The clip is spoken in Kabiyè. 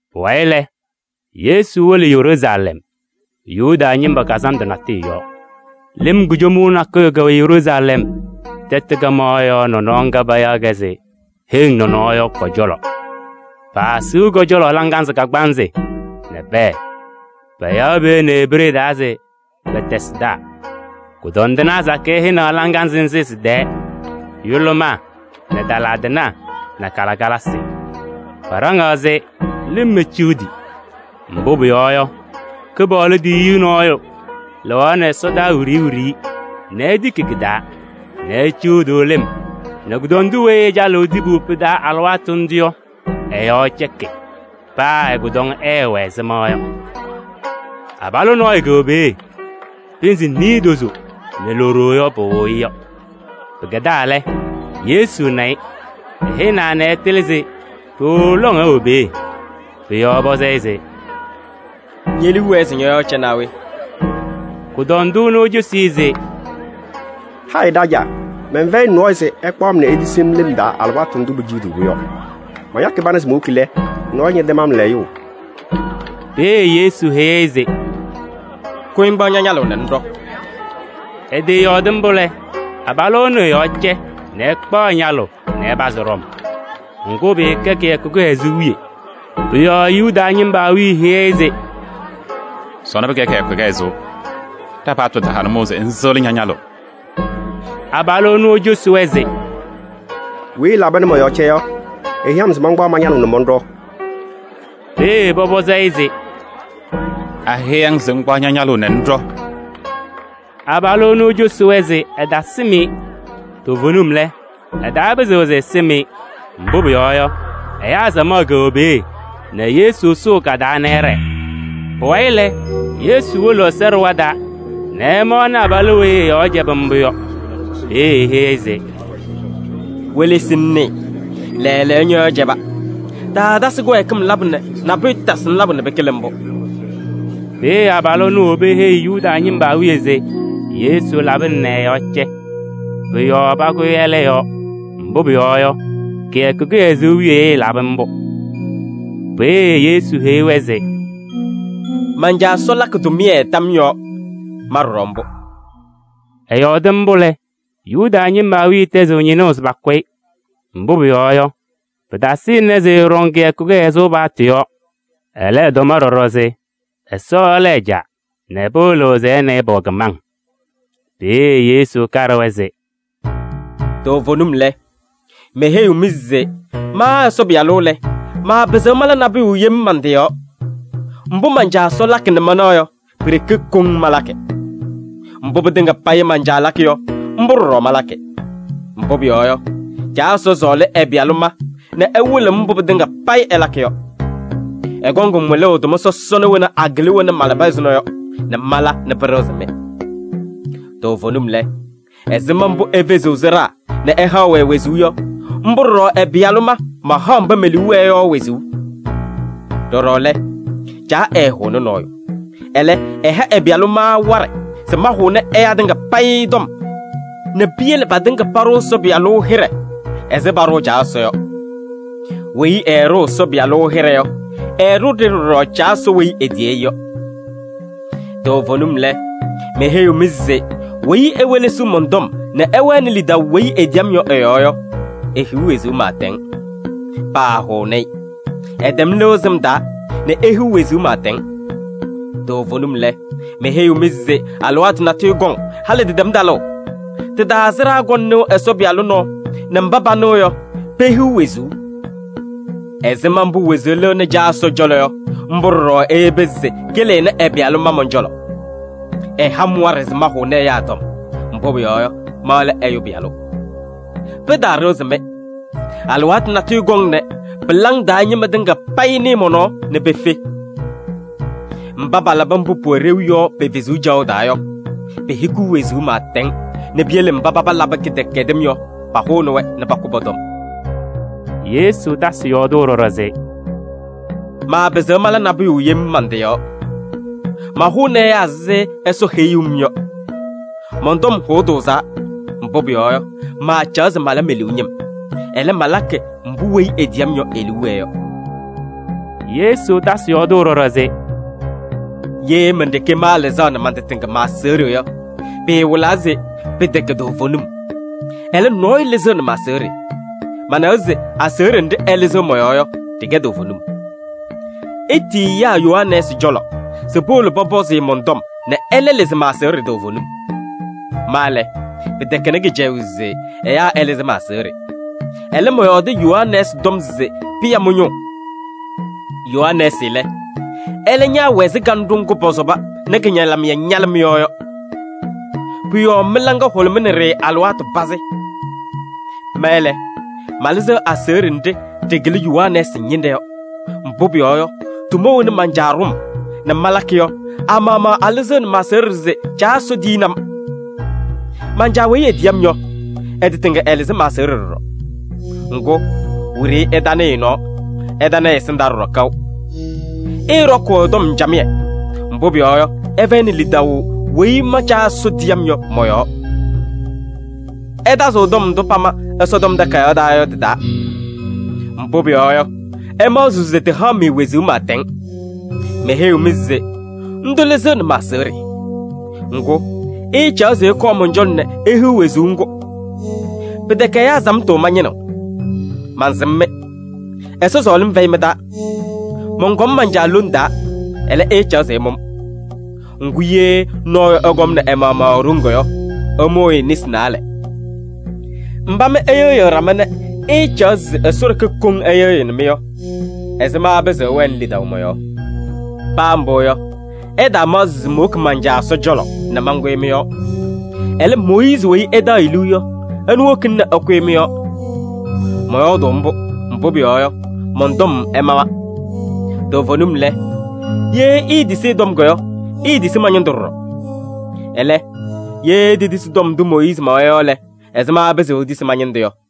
Pʋwayɩ lɛ, Yesu wolo Yeruusalɛm Yuda ñɩma kazandʋ natʋyʋ yɔɔ. Lɩm kujomuu nakʋyʋ wɛ Yeruusalɛm tɛtʋ kaɣmaɣ yɔɔ nɔnɔɔ ŋga payaɣ se Heŋ Nɔnɔɔ yɔ kɔ-cɔlɔ. Paasiɣ kʋ-cɔlɔ laŋazɩ kagbaanzɩ nɛ pɛɛ. Payaɣ peeye nɛ Ebree taa se Betɛsda. Kʋdɔndɩnaa sakɩyɛ hɛnaɣ laŋazɩ nzɩ sɩ-tɛɛ: yʋlʋmaa nɛ tala tɩnaa nɛ kalɩkalasɩ. [Paɖaŋaa se lɩm eciɣdi. Mbʋ pʋyɔɔ yɔ, Kɩpaɣlʋ tiyiyu nɔɔyʋ lɩɣaɣnɩ ɛsɔdaa wiɖiyi wiɖiyi nɛ etiki kɩ-taa nɛ eciɣdiɣ lɩm nɛ kʋdɔndʋ weyi ɛcalɩɣ tibu pɩ-taa alɩwaatʋ ndʋ yɔ, ɛ-yɔɔ cɛkɩ. Paa ɛ-kʋdɔŋ ɛɛwɛ ɛzɩma.] Abalʋ nɔɔyʋ kɛwɛ peeye. Pɩnzɩ niidozo nɛ lutozo yɔ, pɩwɩɣʋ-ɩ yɔ. Pɩkɛdaa lɛ, Yesu na-ɩ, ɛhɛnaa nɛ ɛtɩlɩ se ɖooo lɔŋ ɛwɛ peeye. Pʋ-yɔɔ ɛpɔzɩ-ɩ se: “Ñe-liu wɛɛ se ñɔ-yɔɔ ɛcɛ naa we?” Kʋdɔndʋ ɛnʋ ecosi-i se: “Hayɩ Ɖajaa! Mɛnfɛyɩ nɔɔyʋ se ɛkpaɣ-m nɛ etisi-m lɩm taa alɩwaatʋ ndʋ peciɣdiɣ-pʋ yɔ. Mañakɩ pana se mowoki lɛ, nɔɔyʋ ñɛtɛm-m layʋʋ.” Peeye Yesu heyi-i se: “Kʋyɩ ŋkpaɣ ña-ñalʋʋ nɛ ŋɖɔ!” Ɛtɩyɔɔdɩ mbʋ lɛ, abalʋ ɛnʋ ɛ-yɔɔ cɛ nɛ ɛkpaɣ ɛ-ñalʋʋ nɛ ɛpazɩ ɖɔm. Ŋgʋ, pɩɩkɛ kɩyakʋ kɩhɛzʋʋ wiye. Pʋ-yɔɔ Yuda ñɩma awiya heyi-i se: “Sɔnɔ pɩkɛ kɩyakʋ kɩhɛzʋʋ, ɖa-paɣtʋ taha nʋmɔʋ se ŋsɩɣlɩ ña-ñalʋʋ.” Abalʋ ɛnʋ ecosi-wɛ se: “Weyi ɛlaba nɛ mɔ-yɔɔ cɛ yɔ, eheyi-m se mankpaɣ ma-ñalʋʋ nɛ mɔnɖɔ.” Peeye pɔpɔzɩ-ɩ se: “Anɩ ñeheyi-ŋ se ŋkpaɣ ña-ñalʋʋ nɛ ŋɖɔ?” Abalʋ ɛnʋ ecosi-wɛ se ɛtasɩm-ɩ. Toovenim lɛ, ɛtapɩzɩɣ se ɛsɩm-ɩ. Mbʋ pʋyɔɔ yɔ, ɛyaa samaɣ kɛwɛ peeye nɛ Yesu sʋʋ ka-taa nɛ ɛɖɛɛ. Pʋwayɩ lɛ, Yesu wolo Ɛsɔ ɖɩɣa taa nɛ ɛmaɣnɩ abalʋ weyi ɛ-yɔɔ cɛbɩ mbʋ yɔ. Peeye eheyi-i se: “Welesi ŋnɩɩ, lɛɛlɛɛyɔ, ñɔ-yɔɔ cɛba. Taatasɩ kɩwɛɛkɩm labʋ nɛ nabʋyʋ tasɩ-ŋ labʋ nɛ pɩkɩlɩ mbʋ.” Peeye abalʋ ɛnʋ ewobi eheyi Yuda ñɩma awiya se Yesu labɩna nɛ ɛ-yɔɔ cɛ. Pʋ-yɔɔ pakʋyɩ ɛlɛ yɔɔ, mbʋ pʋyɔɔ yɔ, kɩyakʋ kɩhɛzʋʋ wiye ɛlabɩ mbʋ. Peeye Yesu heyi-wɛ se: “Man-Caa Ɛsɔ lakɩ tʋmɩyɛ tam yɔɔ, ma ɖɔɖɔ mbʋ.” Ɛyɔɔdɩ mbʋ lɛ, Yuda ñɩma awiya tɛzɩɣ ñɩnʋʋ se pakʋ-ɩ. Mbʋ pʋyɔɔ yɔ, pɩtasɩnɩ se ɛtɔɖɔ kɩyakʋ kɩhɛzʋʋ paɣtʋ yɔɔ, ɛlɛ, ɛtɔm ɖɔɖɔ se Ɛsɔ lɛ ɛ-Caa nɛ pɩwɩlɩɣ se ɛ nɛ ɩ pɛwɛ kɩmaŋ. Peeye Yesu kaɖɩ-wɛ se: “Toovenim lɛ, meheyiɣ-mɩ se ma Ɛsɔ Pɩyalʋ lɛ, maapɩzɩɣ mala nabʋyʋ yem man-tɩ yɔɔ. Mbʋ man-Caa Ɛsɔ lakɩ nɛ manaɣ yɔ, pi-ɖeke koŋ malakɩ. Mbʋ pɩtɩŋa payɩ man-Caa lakɩ yɔ, mbʋ ɖɔɖɔ malakɩ. Mbʋ pʋyɔɔ yɔ, Caa Ɛsɔ sɔɔlɩ ɛ-Pɩyalʋ ma nɛ ɛwɩlɩɣ-m mbʋ pɩtɩŋa payɩ ɛlakɩ yɔ. Ɛkɔŋ-m wɩlʋʋ tʋma sɔsɔna wena akɩlɩ wena malaba ɛzʋnɔ yɔ nɛ mala nɛ pɩɖɩɣzɩ-mɩ. Toovenim lɛ, ɛzɩma mbʋ efeziɣ sɩɖaa nɛ ɛhaɣ-wɛ wezuu yɔ, mbʋ ɖɔɖɔ ɛ-Pɩyalʋ ma, mahaɣ mba me-liu wɛɛ yɔ wezuu. Ɖɔɖɔ lɛ, Caa ɛɛhʋʋnɩ nɔɔyʋ. Ɛlɛ, ɛha ɛ-Pɩyalʋ ma waɖɛ se mahʋnɩ ɛyaa tɩŋa payɩ tɔm nɛ piyele patɩŋa paɖʋ Ɛsɔ Pɩyalʋ hɩɖɛ ɛzɩ paɖʋʋ Caa Ɛsɔ yɔ. Weyi ɛɛɖʋʋ Ɛsɔ Pɩyalʋ hɩɖɛ yɔ, ɛɛɖʋʋ-ɖɩ ɖɔɖɔ Caa Ɛsɔ weyi etiyi-i yɔ. Toovenim lɛ, meheyiɣ-mɩ se weyi ewelesiɣ mɔn-tɔm nɛ ɛwɛnɩ lidaʋ weyi etiyi-m yɔ ɛ-yɔɔ yɔ, ehiɣ wezuu pɩɩtɛŋ. Paahʋʋnɩ-ɩ. Ɛtɛm lɩʋ sɩm taa nɛ ehiɣ wezuu pɩɩtɛŋ. Toovenim lɛ, meheyiɣ-mɩ se alɩwaatʋ natʋyʋ kɔŋ, halɩ tɩtɛm talʋʋ. Tɩ-taa sɩɖaa kɔŋ nɩʋ Ɛsɔ Pɩyalʋ nɔɔ nɛ mba panɩɣ yɔ, pehiɣ wezuu. Ɛzɩma mbʋ wezuu lɩɣnɩ Caa Ɛsɔ cɔlɔ yɔ, mbʋ ɖɔɖɔ eyebi se kɩlɩnɩ ɛ-Pɩyalʋ ma mɔn-cɔlɔ. Ɛha-m waɖɛ se mahʋnɩ ɛyaa tɔm, mbʋ pʋyɔɔ yɔ, ma lɛ Ɛyʋ Pɩyalʋ. Pɩtaaɖɩɣzɩ-mɩ. Alɩwaatʋ natʋyʋ kɔŋ nɛ pɩlaŋ taa ñɩma tɩŋa payɩ nɩɩ mɔ-nɔɔ nɛ pefe. Mba palabɩ mbʋ pʋwɛ ɖeu yɔ pe-wezuu caɣʋ taa yɔ, pehikiɣ wezuu pɩɩtɛŋ nɛ piyele mba paba labɩ kɩdɛkɛdɩm yɔ, pahʋnɩ-wɛ nɛ pakʋ pɔ-tɔm.” Yesu tasɩ yɔɔdʋʋ ɖɔɖɔ se: “Maapɩzɩɣ mala nabʋyʋ yem man-tɩ yɔɔ. Mahʋʋnɩ ɛyaa ɛzɩ Ɛsɔ heyuu-m yɔ. Mɔn-tɔm hʋʋ tʋʋzaa, mbʋ pʋyɔɔ yɔ, maacaɣ se mala me-liu ñɩm. Ɛlɛ, malakɩ mbʋ weyi etiyi-m yɔ e-liu wɛɛ yɔ.” Yesu tasɩ yɔɔdʋʋ ɖɔɖɔ se: “Ye men-ɖeke maalɩzaɣnɩ man-tɩ tɩŋa ma-aseɣɖe yɔ, pɩɩwɩlaa se pɩtɛkɛ toovenim. Ɛlɛ, nɔɔyʋ lɩzɩɣnɩ ma-aseɣɖe. Manawa se aseɣɖe nɖɩ ɛlɩzɩɣ mɔ-yɔɔ yɔ, ɖɩkɛ toovenim. Itiyi ɛyaa Yohanɛɛsɩ cɔlɔ se powolo pɔpɔzɩ-ɩ mɔn-tɔm nɛ ɛlɛ lɩzɩ ma-aseɣɖe toovenim. Ma lɛ, pɩtɛkɛnɩ kɩcɛyʋʋ se ɛyaa ɛlɩzɩ ma-aseɣɖe. Ɛlɛ, mɔyɔɔdɩ Yohanɛɛsɩ tɔm se pɩya mɩ-ñʋʋ. Yohanɛɛsɩ lɛ, ɛlɛ ñaawɛ ɛzɩ kanɖʋ ŋgʋ pɔsɔba nɛ kɩ-ñalɩmɩyɛ ñalɩ mɩ-yɔɔ yɔ. Pʋ-yɔɔ mɩ-laŋa hʋlʋmɩnɩ-ɖɩ alɩwaatʋ pazɩ. Ma lɛ, malɩzɩɣ aseɣɖe nɖɩ ɖɩkɩlɩ Yohanɛɛsɩ ñɩnɖɛ yɔ. Mbʋ pʋyɔɔ yɔ, tʋma wena man-Caa ɖʋ-m nɛ malakɩ yɔ, a-maɣmaɣ alɩzɩɣnɩ ma-aseɣɖe se Caa Ɛsɔ tiyini-m. Man-Caa weyi etiyi-m yɔ, ɛ-tɩ tɩŋa ɛlɩzɩ ma-aseɣɖe ɖɔɖɔ. Ŋgʋ, wiɖiyi ɩtanɩɩ ɛ-nɔɔ, ɩtana ɛ-ɛsɩndaa ɖɔɖɔ kaʋ. Ɩɩɖɔkʋʋ ɛ-tɔm camɩyɛ, mbʋ pʋyɔɔ yɔ, ɩfɛyɩnɩ lidaʋ weyi ma Caa Ɛsɔ tiyaa yɔ mɔ-yɔɔ. Ɩtazɩɣ tɔm ndʋ pama Ɛsɔtɔm Takayaɣ taa yɔ tɩ-taa, mbʋ pʋyɔɔ yɔ, ɩmaɣzɩɣ se tɩhaɣ-mɩ wezuu pɩɩtɛŋ. Meheyiɣ-mɩ se ndʋ lɩzɩɣnɩ ma-aseɣɖe! Ŋgʋ, ɩɩcaɣ se ɩkɔɔ mɔn-cɔlɔ nɛ ihiɣ wezuu ŋgʋ! Pɩtɛkɛ ɛyaa samtʋ mañɩnɩɣ. Mansɩm-mɩ: Ɛsɔ sɔɔlɩm fɛyɩ mɩ-taa! Mɔnkɔm man-Caa lone taa, ɛlɛ, ɩɩcaɣ se ɩmʋ-m. Ŋgʋ, ye nɔɔyʋ ɛkɔmnɩ ɛ-maɣmaɣ e-ɖoŋ yɔ, ɩmʋʋ-ɩ nesi naalɛ. Mba mɩ ɩyɩɣyɩɣ ɖama nɛ ɩɩcaɣ se Ɛsɔ ɖeke koŋ ɛyɩɣyɩnɩ-mɩ yɔ, ɛzɩma ɩpɩzɩɣ ɩwɛnɩ lidaʋ mɔ-yɔɔ? Paa mbʋ yɔ, ɩtaamaɣzɩ se mowoki man-Caa Ɛsɔ cɔlɔ nɛ mankʋyɩ mɩ-yɔɔ. Ɛlɛ, Mooyiizi weyi ɩtaɣ-ɩ liu yɔ, ɛnʋ wokina nɛ ɛkʋyɩ mɩ-yɔɔ. Mɔyɔɔdʋʋ mbʋ, mbʋ pʋyɔɔ yɔ, mɔn-tɔm ɛmawa. Toovenim lɛ, ye iitisi ɛ-tɔm yɔ, iitisi ma-ñɩndʋ ɖɔɖɔ. Ɛlɛ, ye itetisi tɔm ndʋ Mooyiizi mawa yɔ lɛ, ɛzɩma ɩpɩzɩɣ itisi ma-ñɩndʋ yɔ?”